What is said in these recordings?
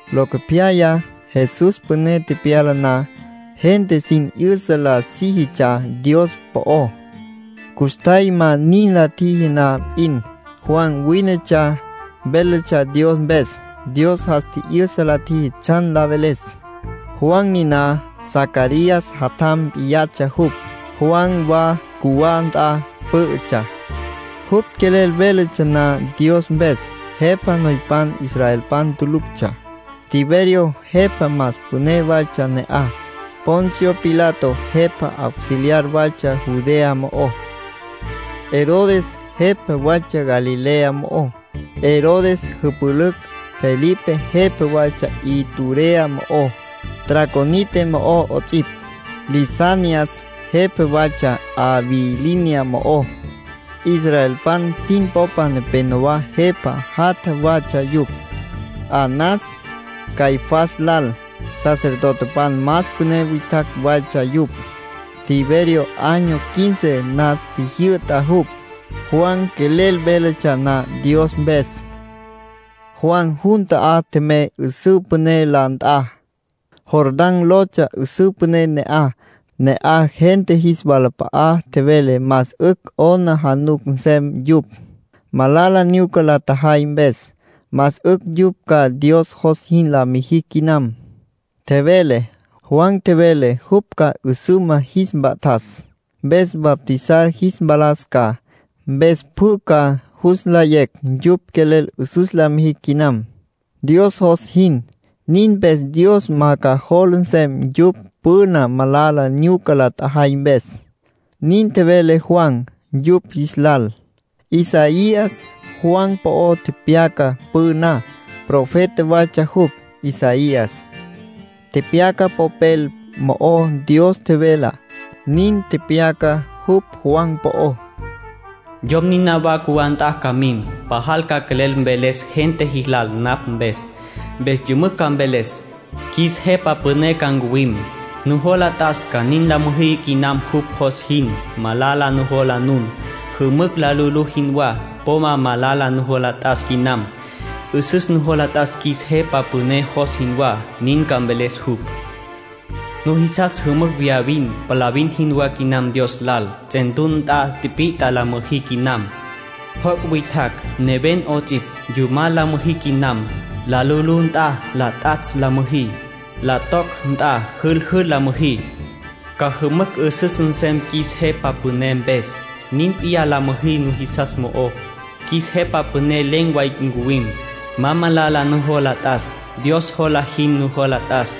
(Locopyaya, Jesús püné tepyala na, gente sin 'yüsa la síjitsja Dios po'ó. Custjay ma nin la tjiji na p'in, Juan wínetsja, véletsja Dios mpes. Dios jas tji'yüsa la tjiji tsjan la veles. Juan niná Zacarías jatjam p'iyatsja jupj.) Juan wa cjuwá nt'a pǘ'ütsja. Jupj quelel véletsja na Dios mpes, jepa noypan israelpan tuluctsja. Tiberio jepa más püné waytsja ne'aj. Poncio Pilato jepa auxiliar waytsja Judea mo'ó. Herodes jepa waytsja Galilea mo'ó. Herodes jüpülücj Felipe jepa waytsja Iturea mo'ó, Traconite mo'ó 'ots'ipj. Lisanias jepa waytsja Abilinia mo'ó. Israelpan sin popa nepénowa jepa jatja watsja yupj. Anás, Caifás lal, sacerdotepan más püné witjacj waytsja yupj. Tiberio año quince nas tjijyü'ta jupj, Juan quelel véletsja na Dios mpes. Juan jun ta'á tjemey 'üsǘ püné la nt'a. Jordán lotsja 'üsǘ püné ne'aj. Ne'aj gente jis walap'a'a tjevele más 'ücj 'aplijila nsem yupj, malala nyuca la tjajay mpes. Más 'ücj yupj ca Dios jos jin la mijicj quinam, tjevele. Juan tjevele jupj ca 'üsüma jis mpa'tas, mpes bautizar jis mpalas ca. Mpes pjü ca jus nlayecj yupj quelel 'üsüs la mijicj quinam, Dios jos jin. Nin mpes Dios ma ca jola nsem yupj püna malala nyuca la tjajay mpes. Nin tjevele Juan yupj jis lal. Isaías Juan po'ó tepyaca püná. Profeta waytsja jupj, Isaías. Tepyaca popel mo'ó Dios tjevelá. Nin tepyaca jupj Juan po'ó: “Yom niná wa cjuwá nt'a ca mim. Pajal ca quelel mveles gente jilal napj mpes. Mpes yümücj ca mveles: ‘Qjuis Jepa Püné ca ncuwim. Nujola t'as ca nin la müjí quinam jupj jos jin. Malala nujola nun, jümücj la lu'ulú jinwá. Po ma malala nujola t'as quinam. 'Üsüs nujola t'as qjuis Jepa Püné jos jinwá’, nin ca mveles jupj. ‘Nujisas jümücj viyavin, palavin jinwá quinam Dios lal. Ts'entuna nt'a tipit'a la müjí quinam. Joc' witjacj, neven 'ots'ipj, yumal la müjí quinam. La lu'ulú nt'a la t'atsj la müjí. La toc nt'a jüljül la müjí. Ca jümücj 'üsüs nsem qjuis Jepa Püné mpes. Nin p'iyá la müjí nujisas mo'ó. Qjuis Jepa Püné len̈ way ncuwim. Ma malala nujola t'as. Dios jola jin nujola t'as.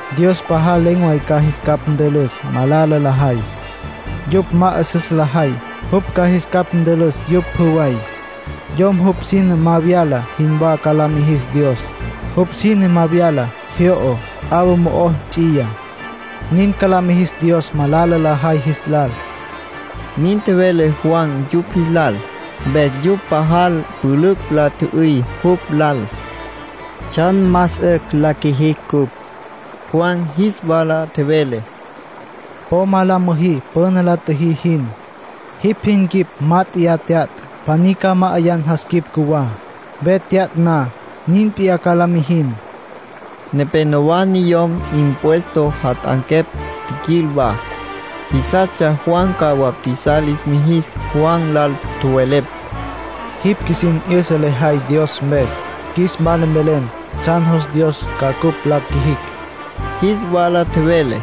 Dios pajal len̈ way ca jis capj ntülüs malala lajay. Yupj ma 'üsüs lajay, jupj ca jis capj ntülüs yupj pjü way. Yom jupj sine ma vyala jinwá ca la mijis Dios. Jupj sine ma vyala, jyo'o, 'awa mo'o ts'iyá. Nin ca la mijis Dios malala lajay jis lal. —Nin tjevele Juan yupj jis lal. Mpes yupj pajal pülücj la tjü'üy jupj lal: —¿Tsjan más 'ücj la qjuijicj cupj? Juan jis wala tjevele: —Po ma la müjí püna la tjüjí jin. Jipj jin quip mat'e tyatj, pjaní ca ma'ayan jas quip cjuwá. Ve tyatj na, nin p'iyá ca la mijin. Nenéyawa niyom impuesto jat'anquepj tjiquil wa. Jisastsja Juan ca bautizar lis mijis. Juan lal tjowelepj: —Jipj qjuisin 'yüsa lejay Dios mpes. Qjuis wala mvelen tsjan jos Dios ca cupj la qjuijicj. Jis wala tjevele: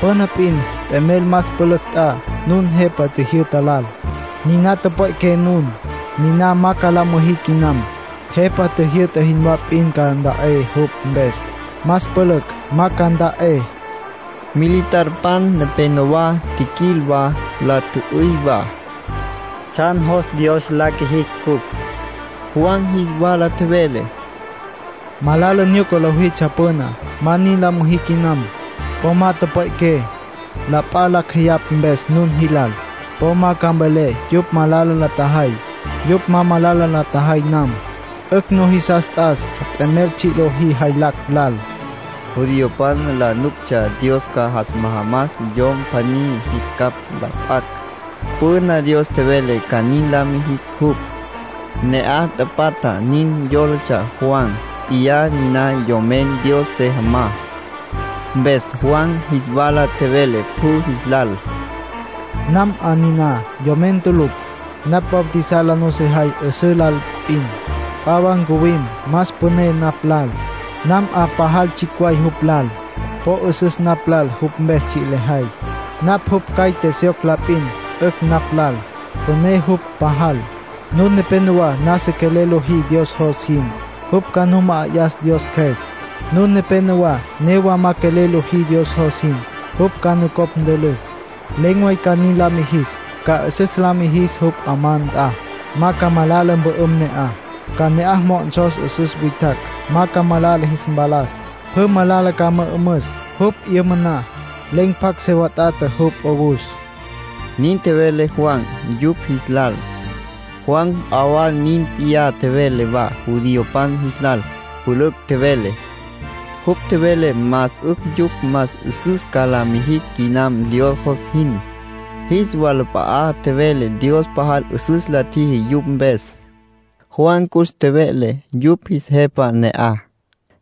—Püna p'in t'emel más pülücj nt'a nun jepa tjijyü'ta lal, niná tüpwe'qué nun. Ninana ma ca la müjí quinam. Jepa tjijyü'ta jinwá p'in ca nta'é jupj mpes. Más pülücj ma ca nta'é. Militarpan nepenowá tjiquil wa, la tjü'üy wa: —¿Tsjan jos Dios la qjuijicj cupj? Juan jis wala tjevele: —Malala nyuca lojitsja püná, ma nin la müjí quinam. Po ma tüpwe'qué, la p'a lacj jeyapj mpes nun jilal. Po ma ca mvelé yupj malala la tjajay, yupj ma malala la tjajay nam. 'Ücj nujisas t'as t'emel tsji' lojí jaylacj lal. Judiopan la nuctsja Dios ca jas majamas Yom pjaní jis capj la p'acj. Püna Dios tjevele ca nin la mijis jupj. Ne'aj tapatja nin yólatsja Juan p'iyá niná Yomen Dios se jamá. Mpes Juan jis wala tjevele pjü jis lal: —Nam 'a niná Yomen tulucj. Napj bautizar la nusejay 'üsǘ lal p'in. P'a wa ncuwim más püné napj lal. Nam 'a pajal tsjicj way jupj lal. Po 'üsüs napj lal jupj mpes tsji' lejay. Napj jupj caite syoc la p'in, 'ücj napj lal. Püné jupj pajal. Nun nepénowa nasa quelel lojí Dios jos jin. Jupj ca nu ma'ayas Dios Cjües. Nun nepénowa newa ma quelel lojí Dios jos jin. Jupj ca nucopj ntülüs. ”Len̈ way ca nin la mijis. Ca 'üsüs la mijis jupj 'amá nt'a, ma ca malala mpü'üm ne'aj. Ca ne'aj mo'onsos 'üsüs witjacj, ma ca malala jis mpalas. Pjü malala ca mü'ümüs; jupj 'yüma na, len̈ pjacj se wat'ata jupj 'owus —nin tjevele Juan yupj jis lal. Juan p'a wa nin p'iyá tjevele wa judiopan jis lal; pülücj tjevele. Jupj tjevele más 'ücj yupj más 'üsüs ca la mijicj quinam Dios jos jin. Jis walap'a'a tjevele Dios pajal 'üsüs la tjiji yupj mpes. Juan cus tjeve'le yupj jis jepa ne'aj,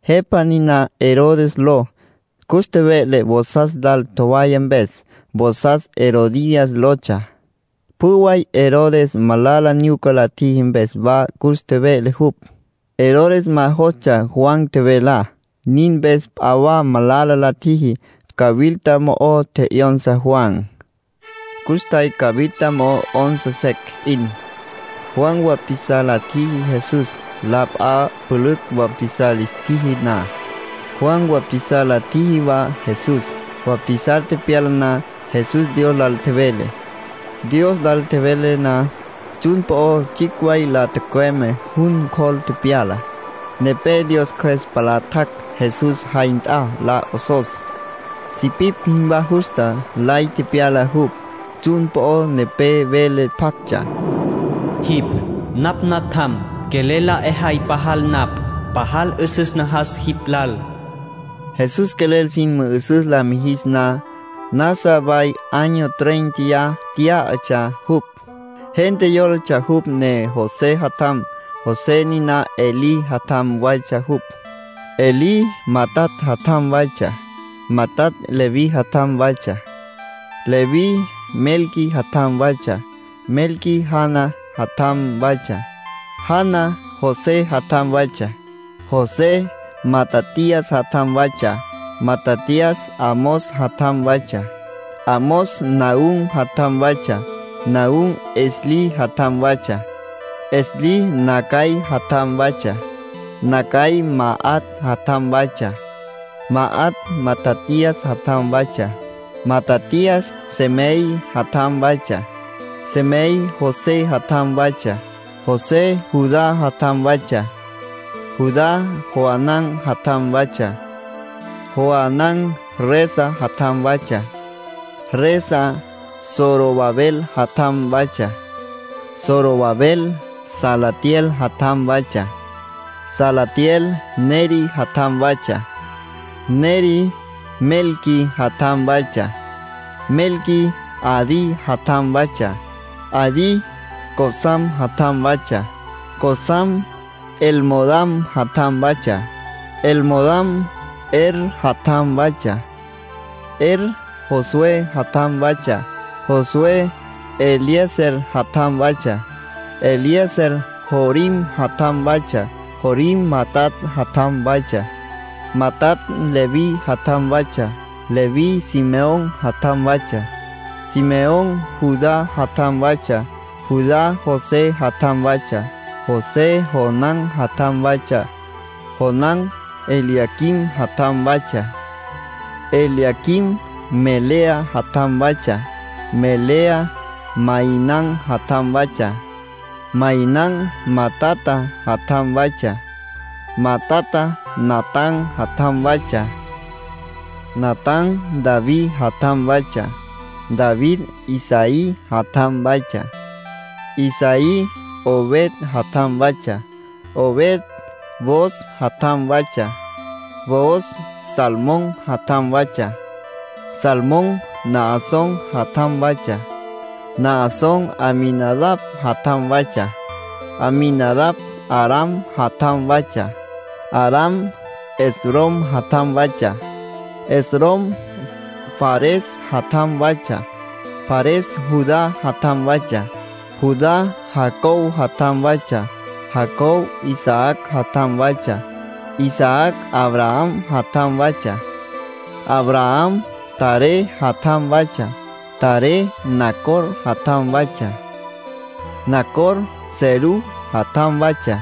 jepa niná Herodes ló. Cus tjeve'le vosas lal tjowaya mpes, vosas Herodías lotsja. Pjü way Herodes malala nyuca la tjiji mpes wa cus tjeve'le jupj. Herodes ma jostsja Juan tjevelá. Nin mpes p'a wa malala la tjiji: cawilta mo'o tje'yonsa Juan. Custjay cawilta mo'o 'onsa secj p'in, Juan bautizar la tjiji Jesús. La p'a pülücj bautizar lis tjiji na, Juan bautizar la tjiji wa Jesús. Bautizar tepyala na, Jesús Dios lal tjevele. Dios lal tjevele na, tsjun po'o tsjicj way la tücüeme, jun cjol tepyala. Nepé Dios Cjües palá tjac' Jesús jay nt'a la 'osos. Sipipj jinwá justa lay tepyala jupj. Tsjun po'o nepé vele pjactsja: “Jipj napj Natjam. Quelel la 'ejay pajal napj. Pajal 'üsüs najas jipj lal.” Jesús quelel sin mü'üsüs la mijis na, nasa way año tréinteya tyá'atsja jupj. Gente yólatsja jupj ne José jatjam. José niná Elí jatjam waytsja jupj. Elí Matat jatjam waytsja; Matat Leví jatjam waytsja; Leví Melqui jatjam waytsja; Melqui Jana jatjam waytsja; Jana José jatjam waytsja; José Matatías jatjam waytsja; Matatías Amós jatjam waytsja; Amós Nahúm jatjam waytsja; Nahúm Esli jatjam waytsja; Esli Nagai jatjam waytsja; Nagai Maat jatjam waytsja; Maat Matatías jatjam waytsja; Matatías Semei jatjam waytsja; Semei José jatjam waytsja; José Judá jatjam waytsja; Judá Joan'an jatjam waytsja; Joan'an Resa jatjam waytsja; Resa Zorobabel jatjam waytsja; Zorobabel Salatiel jatjam waytsja; Salatiel Neri jatjam waytsja; Neri Melqui jatjam waytsja; Melqui Adi jatjam waytsja; Adi Cosam jatjam waytsja; Cosam Elmodam jatjam waytsja; Elmodam Er jatjam waytsja; Er Josué jatjam waytsja; Josué Eliezer jatjam waytsja; Eliezer Jorim jatjam waytsja; Jorim Matat jatjam waytsja; Matat Leví jatjam waytsja; Leví Simeón jatjam waytsja; Simeón Judá jatjam waytsja; Judá José jatjam waytsja; José Jonán jatjam waytsja; Jonán Eliaquim jatjam waytsja; Eliaquim Melea jatjam waytsja; Melea Mainán jatjam waytsja; Mainán Matata jatjam waytsja; Matata Natán jatjam waytsja; Natán David jatjam waytsja; David Isaí jatjam waytsja; Isaí Obed jatjam waytsja; Obed Booz jatjam waytsja; Booz Salmón jatjam waytsja; Salmón Naasón jatjam waytsja; Naasón Aminadab jatjam waytsja; Aminadab Aram jatjam waytsja; Aram Esrom jatjam waytsja; Esrom Fares jatjam waytsja; Fares Judá jatjam waytsja; Judá Jacob jatjam waytsja; Jacob Isaac jatjam waytsja; Isaac Abraham jatjam waytsja; Abraham Taré jatjam waytsja; Taré Nacor jatjam waytsja; Nacor Serug jatjam waytsja;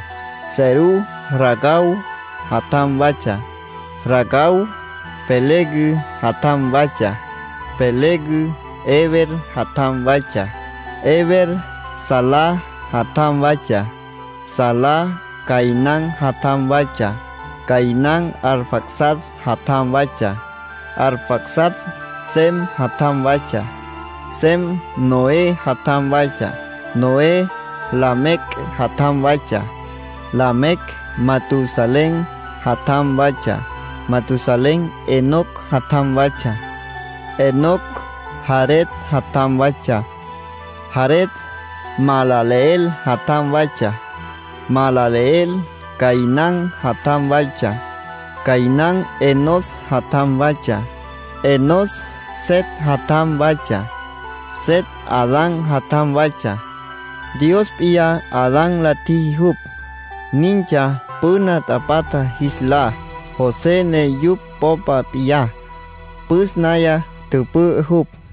Serug Ragau jatjam waytsja; Ragau Peleg jatjam waytsja; Peleg Heber jatjam waytsja; Heber Sala jatjam waytsja; Sala Cainán jatjam waytsja; Cainán Arfaxad jatjam waytsja; Arfaxad Sem jatjam waytsja; Sem Noé jatjam waytsja; Noé Lamec jatjam waytsja; Lamec Matusalén jatjam waytsja; Matusalén Enoc jatjam waytsja; Enoc Jared jatjam waytsja; Jared Mahalaleel jatjam waytsja; Mahalaleel Cainán jatjam waytsja; Cainán Enós jatjam waytsja; Enós Set jatjam waytsja; Set Adán jatjam waytsja, Dios p'iyá Adán la tjiji jupj. Nintsja püna tapatja jis lá, José ne yupj popa p'iyá, püs naya tüpü'ü jupj.